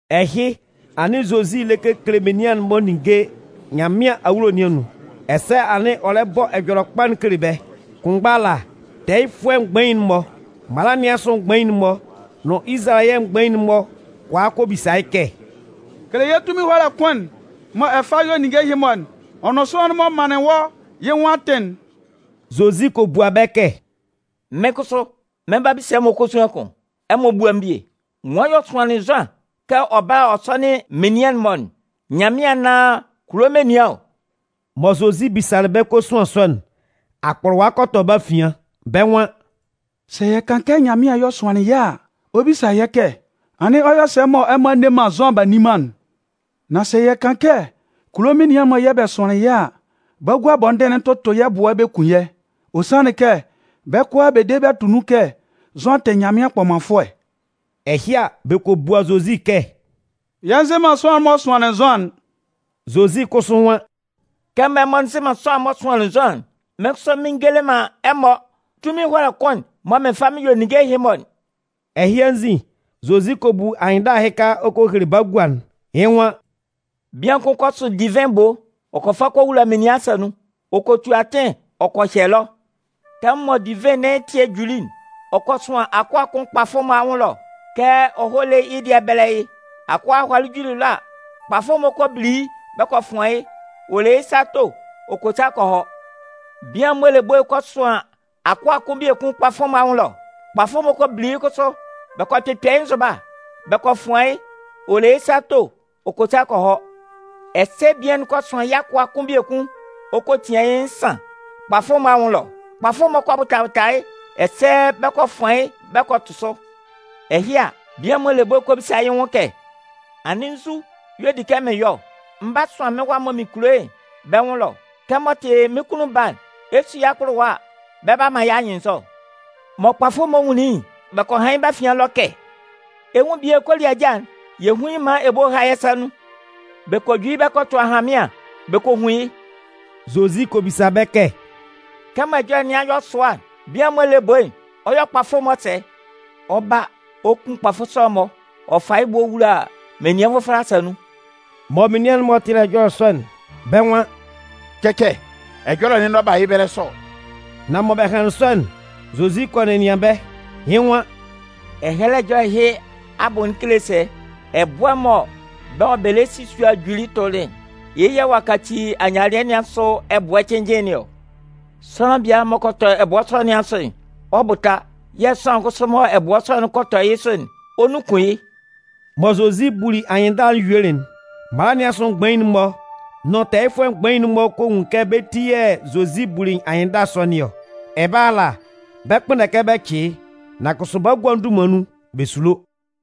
Ɛhɩ, anɩn Zozi lɛ kekele menian'n-mɔ ninnge Nyanmɩan awulo nɩn anun, ɛsɛ anɩn ɔ lɛ bɔ Ɛjɔlɛkpa'n kele bɛ́. Kʋnmgba ala, tɛɛyɩfʋɛ mgbain'n-mɔ, mala nɩn asʋ mgbain'n-mɔ nʋn Izalayɛ mgbain'n-mɔ kɔ a kɔ bisa yɩ́ kɛ: “Kele yɛ́ tunmin ɛhɔlɛ kʋn'n mɔ ɛ fa yɔ ninnge ɛhɩ-mɔ'n, ɔ nʋn sʋanlan'n m'ɔ manlɩn wɔ́ yɩ́ nwʋn atɩn'n?” Zozi kɔ bua bɛ́ kɛ: “Mɩ́n kʋsʋ mɩ́n, mɩn 'ba bisa ɛmɔ kosuan kʋn. Ɛmɔ búa mɩ́n bie. Nwan y'ɔ sʋanlɩn Zʋan kɛ ɔ bála ɔ sɔ́nɩn menian'n-mɔ'n, Nyanmɩan anaan kulo menian ɔ?” Mɔ Zozi bisalɩ bɛ́ kosuan sɔ'n, akpʋlʋwa kɔ tɔ bɛ́ afian. Bɛ́ nwan: “Sɛ yɛ kan kɛ: ‘Nyanmɩan y'ɔ sʋanlɩn yɩ́’ a, ɔ 'bisa yɛ́ kɛ: ‘Anɩn ɔ yɔ sɛ mɔ ɛmɔ a nne man Zʋan b'a nni man'n?’ Nan sɛ yɛ kan kɛ: ‘Kulo menian'n-mɔ yɛ̂ bɛ sʋanlɩn yɩ́’ a, bagua bɔndɩn'n 'tʋtʋ yɛ́ ɛbʋɛ bɛ kun yɛ́. Ɔ sanlɩn kɛ, bɛ́ kʋalaa bɛ de bɛ tʋ nun kɛ Zʋan tɩ Nyanmɩan kpɔmanfʋɛ.” Ɛhɩ a, bɛ kɔ bua Zozi kɛ: “Yɛ nzɩ man sʋanlan'n m'ɔ sʋanlɩn Zʋan'n.” Zozi kʋsʋ nwan: “Kɛmɔ ɛmɔ nzɩ man sʋanlan'n m'ɔ sʋanlɩn Zʋan'n, mɩ́n kʋsʋ mɩn ngele man ɛmɔ tunmin ɛhɔlɛ kʋn'n mɔ mɩn fa mɩn yɔ ninnge ɛhɩ-mɔ'n.” Ɛhɩ anzin, Zozi kɔ bu anyɩnndala ɛhɩka ɔ kɔ hele bagua'n, yɩ́ nwan: “Bian kʋn kɔ sʋn divɩn ebo. Ɔ kɔ fa kɔ wula menian asa nun, ɔ kɔ tu atɩn ɔ kɔ hyɛ ɛlɔ. Tɛmʋn mɔ divɩn nɩn ɛtɩɛ'n juli'n, ɔ kɔ sʋan akʋa kʋn kpafʋ'n-mɔ anwʋn ɛlɔ kɛ ɔ hɔ́ lé yɩ́ dɩɛ'n bɛ́lɛ yɩ́. Akʋa'n hɔlɩ juli ɛlɔ a, kpafʋ'n-mɔ kɔ bili yɩ́ bɛ kɔ fʋan yɩ́, ɔ le yɩ́ sa to ɔ kɔ sa kɔ hɔ. Bian'n m'ɔ le ebo'n kɔ sʋan akʋa kʋn biekun kpafʋ'n-mɔ anwʋn ɛlɔ. Kpafʋ'n-mɔ kɔ bili yɩ́ kʋsʋ, bɛ kɔ kpɩkpɛ yɩ́ nzʋba, bɛ kɔ fʋan yɩ́, ɔ le yɩ́ sa to ɔ kɔ sa kɔ hɔ. Ɛsɛ bian'n kɔ sʋan yɩ́ akʋa'n kʋn biekun ɔ kɔ tian yɩ́ nsan kpafʋ'n-mɔ anwʋn ɛlɔ. Kpafʋ'n-mɔ kɔ bʋta bʋta yɩ́, ɛsɛ bɛ kɔ fʋan yɩ́ bɛ kɔ tʋ sʋ. “Ɛhɩ a, bian'n m'ɔ le ebo'n kɔ bisa yɩ́ nwʋn kɛ: ‘Anɩn nzu y'ɔ di kɛ mɩn yɔ ɔ? Mɩn 'ba sʋan mɩ́n wa'n mɔ mɩn kulo yɩ́'n bɛ́ nwʋn ɛlɔ. Kɛmɔ ɔ tɩ mɩ́n kunnun baa'n, ɛ 'su yɩ́ akpʋlʋwa a, bɛ 'ba man yɩ́ anyɩnnzɔ.’ “Mɔ kpafʋ'n-mɔ nwunlin yɩ́'n, bɛ kɔ han yɩ́ bɛ́ afian ɛlɔ kɛ: ‘Ɛ 'nwun bian'n koliaja'n. Yɛ hún yɩ́ maan ebo'n há yɛ́ sa nun.’ Bɛ kɔ ju yɩ́ bɛ kɔ tʋ ahanmɩan bɛ kɔ hun yɩ́.” Zozi kɔ bisa bɛ́ kɛ: “Kɛmɔ ɛjɔlɛ nɩn a yɔ sʋa'n, bian'n m'ɔ le ebo'n, ɔ 'yɔ kpafʋ'n-mɔ sɛ? Ɔ 'ba, ɔ 'kun kpafʋ sɔ'n-mɔ ɔ fa yɩ́ ebo'n ɔ wula menian nvʋfɔlɛ asa nun.” Mɔ menian'n-mɔ tɩlɩ ɛjɔlɛ sɔ'n, bɛ́ nwan: “Cɛcɛ, ɛjɔlɛ'n n'ɔ ba yɩ́ ɛbɛlɛ sɔ!” Nan mɔ bɛ hanlɩn sɔ'n, Zozi kɔ nɛnɩan bɛ́. Yɩ́ nwan: “Ɛhɛlɛ Ɛjɔlɛ ɛhɩ abʋ'n kele sɛ? Ɛbʋɛ'n mɔ bɛ́ mɔ bɛ lɛ si sua'n juli tʋlɩ'n, yɩ́ yɛ̂ ɔ'a kaci ayialɩɛ nɩn asʋ ɛbʋɛ cɩnnjɩn nɩn ɔ. Sʋanlan biala m'ɔ kɔ tɔ ɛbʋɛ sɔ nɩn asʋ'n, ɔ 'bʋta yɛ̂ sʋanlan kʋsʋ mɔ ɛbʋɛ sɔ'n kɔ tɔ yɩ́ sʋ'n, ɔ 'nunkun yɩ́.” Mɔ Zozi buli anyɩnndala'n yuelɩ'n, mala nɩn asʋ mgbain'n-mɔ nʋn tɛɛyɩfʋɛ mgbain'n-mɔ kɔ nwun kɛ bɛ́ ti yɛ̂ Zozi buli anyɩnndala sɔ nɩn ɔ. Ɛbɛlɛ ala, bɛ 'kpʋnndɛ kɛ bɛ cɩ yɩ́. Nan kʋsʋ bagua'n dunman nun, bɛ sulo.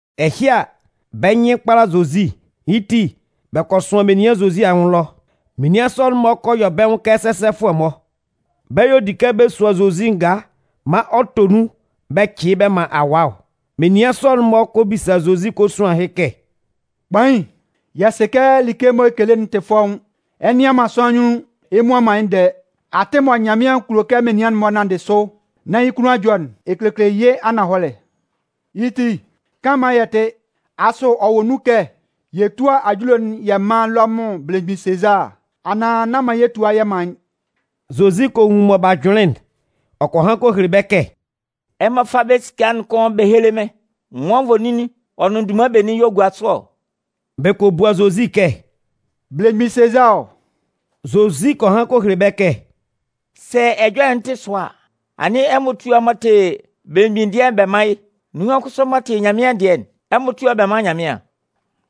Ɛhɩ a, bɛ́ nyɩn kpala Zozi. Yɩ́ ti, bɛ kɔ sʋan menian Zozi anwʋn ɛlɔ. Menian sɔ'n-mɔ kɔ yɔ bɛ́ nwʋn kɛ sɛsɛfʋɛ-mɔ. Bɛ́ y'ɔ di kɛ bɛ sua Zozi ngaa maan ɔ tɔ nun bɛ cɩ yɩ́ bɛ man awaa ɔ. Menian sɔ'n-mɔ kɔ bisa Zozi kosuan ɛhɩ kɛ: “Kpain, yɛ sɩ kɛ like mɔ ɛ kekele'n tɩ fɔ́ʋ́n. Ɛ nnɩan man sʋanlan anyunnun ɛ mmua man yɩ́ ndɛɛ. Atɩn mɔ Nyanmɩan kulo kɛ menian'n-mɔ nanndɩ sʋ nán yɩ́ kunnun a jɔ'n, ɛ kekele yɩ́ ananhɔlɛ. Yɩ́ ti, kan maan yɛ tɩ́. Asʋ ɔ wɔ nun kɛ yɛ túa ajule'n yɛ mán Lɔmʋn belemgbin Sezaa anaan nán man yɛ tua yɛ man yɩ́?” Zozi kɔ nwun mɔ b'a jʋnlɩn'n. Ɔ kɔ han kɔ hele bɛ́ kɛ: “Ɛmɔ fá bɛ́ esika'n kʋn bɛ héle mɩ́n. Nwan nvoninnin ɔ nʋn dunman benin y'ɔ gua sʋ ɔ?” Bɛ kɔ bua Zozi kɛ: “Belemgbin Sezaa ɔ.” Zozi kɔ han kɔ hele bɛ́ kɛ: “Sɛ ɛjɔlɛ'n tɩ sʋa a, anɩn ɛmɔ túa m'ɔ tɩ belemgbin dɩɛ'n bɛ mán yɩ́, nunhan kʋsʋ m'ɔ tɩ Nyanmɩan dɩɛ'n, ɛmɔ túa bɛ mán Nyanmɩan.”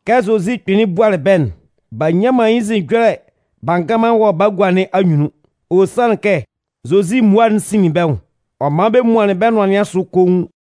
Kɛ Zozi kpɩnlɩn bualɩ bɛ́'n, b'a nnyan man yɩ́ nzin ɛjɔlɛ b'a ngan man wɔ bagua nɩn anyunnun. Ɔ sanlɩn kɛ Zozi mmua'n sinlin bɛ́ nwʋn. Ɔ man bɛ muanlɩn bɛ́ nʋan nɩn asʋ koun.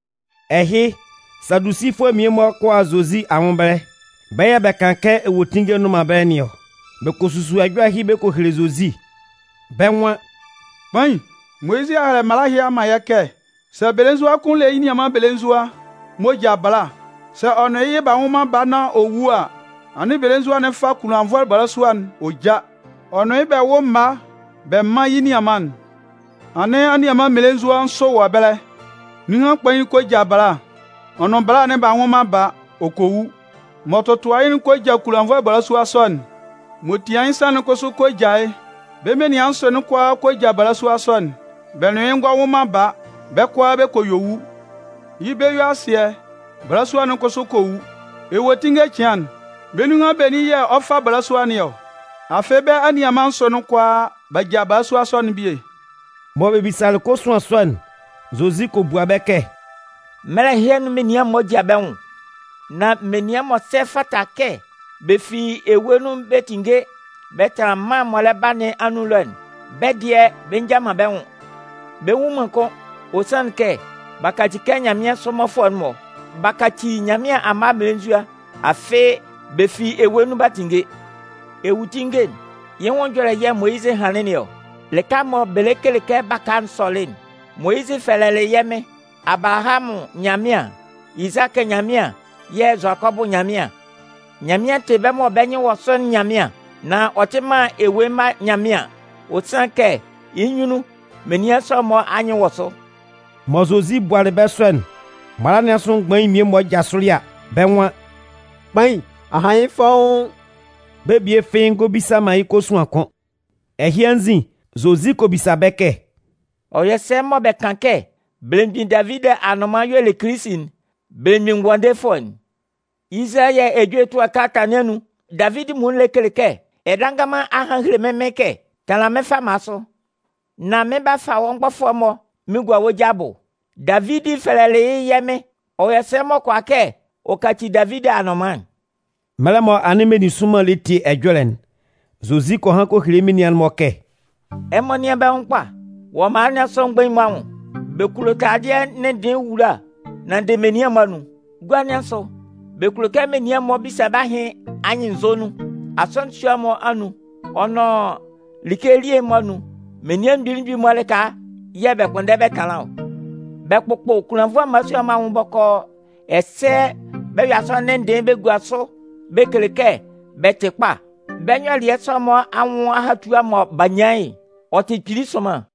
Ɛhɩ, Sadusifʋɛ mmie-mɔ kɔ a Zozi anwʋn ɛbɛlɛ. Bɛ́ yɛ̂ bɛ kan kɛ ewuetinnge nnʋn man ɛbɛlɛ nɩn ɔ. Bɛ kɔ susu ɛjɔlɛ ɛhɩ bɛ kɔ hele Zozi, bɛ́ nwan: “Kpain, Moyizɩ a hɛlɛ mala ɛhɩ a man yɛ́ kɛ: Sɛ belenzua kʋn le yɩ́ nianman belenzua m'ɔ ja bala, sɛ ɔ nʋn yɩ́ yɩ b'a nwʋn man baa nán ɔ wu a, anɩn belenzua'n fá kunlannvʋɛ balasua'n ɔ já. Ɔ nʋn yɩ́ bɛ wʋ́ mma bɛ mán yɩ́ nianman'n. Anɩn anianman mmelenzua nsʋ wɔ ɛbɛlɛ. Nunhan kpain'n kɔ ja bala. Ɔ nʋn bala'n b'a nwʋ man baa, ɔ kɔ wu. M'ɔ tɔtʋa yɩ́'n kɔ ja kunlannvʋɛ balasua sɔ'n. M'ɔ tian yɩ́ nsan'n kʋsʋ kɔ ja yɩ́. Bɛ́ menian'n nsʋ'n kʋalaa bɛ kɔ ja balasua sɔ'n, bɛ nʋn yɩ́ ngɔ wʋ man baa, bɛ́ kʋalaa bɛ kɔ yue wu. Yɩ́ bɛ-yue-asɩɛ, balasua'n kʋsʋ kɔ wu. Ewuetinnge cɩan'n, bɛ́ nunhan benin yɛ̂ ɔ 'fa bala nɩn ɔ? Afɩ bɛ́ anianman nsʋ'n kʋalaa b'a ja balasua sɔ'n bie!” Mɔ bɛ bisalɩ kɔsuan sɔ'n, Zozi kɔ bua bɛ́ kɛ: “Mɛlɛ ɛhɩ anun menian'n-mɔ ja bɛ́ nwʋn. Nan menian m'ɔ sɛ fata kɛ bɛ fi ewue nun bɛ tínnge bɛ tánlan mân'n m'ɔ lɛ ba nɩn anun ɛlɔ'n, bɛ́ dɩɛ bɛ nja man bɛ́ nwʋn. Bɛ nwu man kʋ́n, ɔ sanlɩn kɛ, bɛ 'ba kaci kɛ nyanmɩansʋ mmɔfʋɛ'n-mɔ. Bɛ 'kaci Nyanmɩan amma mmelenzua, afɩ bɛ fi ewue nun b'a tinnge. Ewuetinnge'n, yɩ́ nwʋn ɛjɔlɛ yɛ̂ Moyizɩ hanlɩn nɩn ɔ. Lɩka'n mɔ bɛ lɛ kele kɛ baka'n sɔlɩ'n, Moyizɩ fɛlɛlɩ yɛ́ Mɩn ‘Abalahamʋn Nyanmɩan, Izakɩ Nyanmɩan yɛ̂ Zʋakɔbʋ Nyanmɩan.’ Nyanmɩan tɩ bɛ́ mɔ bɛ́ nyɩn wɔ sʋ'n Nyanmɩan, nan ɔ tɩ man ewue mma Nyanmɩan. Ɔ sanlɩn kɛ yɩ́ nyunnun, menian sɔ'n-mɔ anyɩn wɔ sʋ.” Mɔ Zozi bualɩ bɛ sɔ'n, mala nɩn asʋ mgbain mmie-mɔ jasʋlɩ a, bɛ́ nwan: “Kpain, a han yɩ́ fɔ́ʋ́n.” Bɛ́ bie fɩ́ɩ́ ngɔ bisa yɩ́ kosuan kʋ́n. Ɛhɩ anzin, Zozi kɔ bisa bɛ́ kɛ: “Ɔ yɔ sɛ mɔ bɛ kan kɛ belemgbin Davidi anʋnman y'ɔ le Kilisi'n, Belemgbin Ngʋandefʋɛ'n? Izalayɛ ejue ɛtʋɛ kalata nɩn anun, Davidi muonun lɛ kele kɛ: Ɛdannganman a han a hele mɩ́n Mɩn kɛ: Tanlan mɩ́n fama sʋ, nán mɩn 'ba fa wɔ́ mgbɔfʋɛ'n-mɔ mɩn gua wɔ́ ja abʋ. Davidi fɛlɛ yɩ́ ‘yɛ́ Mɩn’ Ɔ yɔ sɛ m'ɔ kʋala kɛ ɔ kaci Davidi anʋnman'n?” Mɛlɛ mɔ anɩn meninsʋnman lɛ tie ɛjɔlɛ'n, Zozi kɔ han kɔ hele yɩ́ menian'n-mɔ kɛ: “Ɛmɔ nɩ́an bɛ́ nwʋn kpa wɔ mala nɩn asʋ mgbain'n-mɔ anwʋn. Bɛ kulo taladɩɛ ndɩnndɩɩn ewula nanndɩ menian'n-mɔ anun. Gua nɩn asʋ, bɛ kulo kɛ menian bisa bɛ́ ahɩn anyɩnnzɔ nun. Asɔnɩn sua'n-mɔ anun ɔ nʋn like elie'n-mɔ anun, menian mgbili mgbili lɩka yɛ̂ bɛ kpʋnndɛ bɛ tanlan ɔ. Bɛ kpʋkpʋ kunlannvʋɛ mmalasua'n-mɔ anwʋn bɔkɔɔ, ɛsɛ bɛ yɔ asɔnɩn ndɩnndɩɩn bɛ gua sʋ bɛ kele kɛ bɛ tɩ kpa. Bɛ́ nyɔlɩɛ sɔ'n-mɔ anwʋn ahatua mɔ bɛ 'ba nyan yɩ́'n, ɔ tɩ kpili sʋnman!”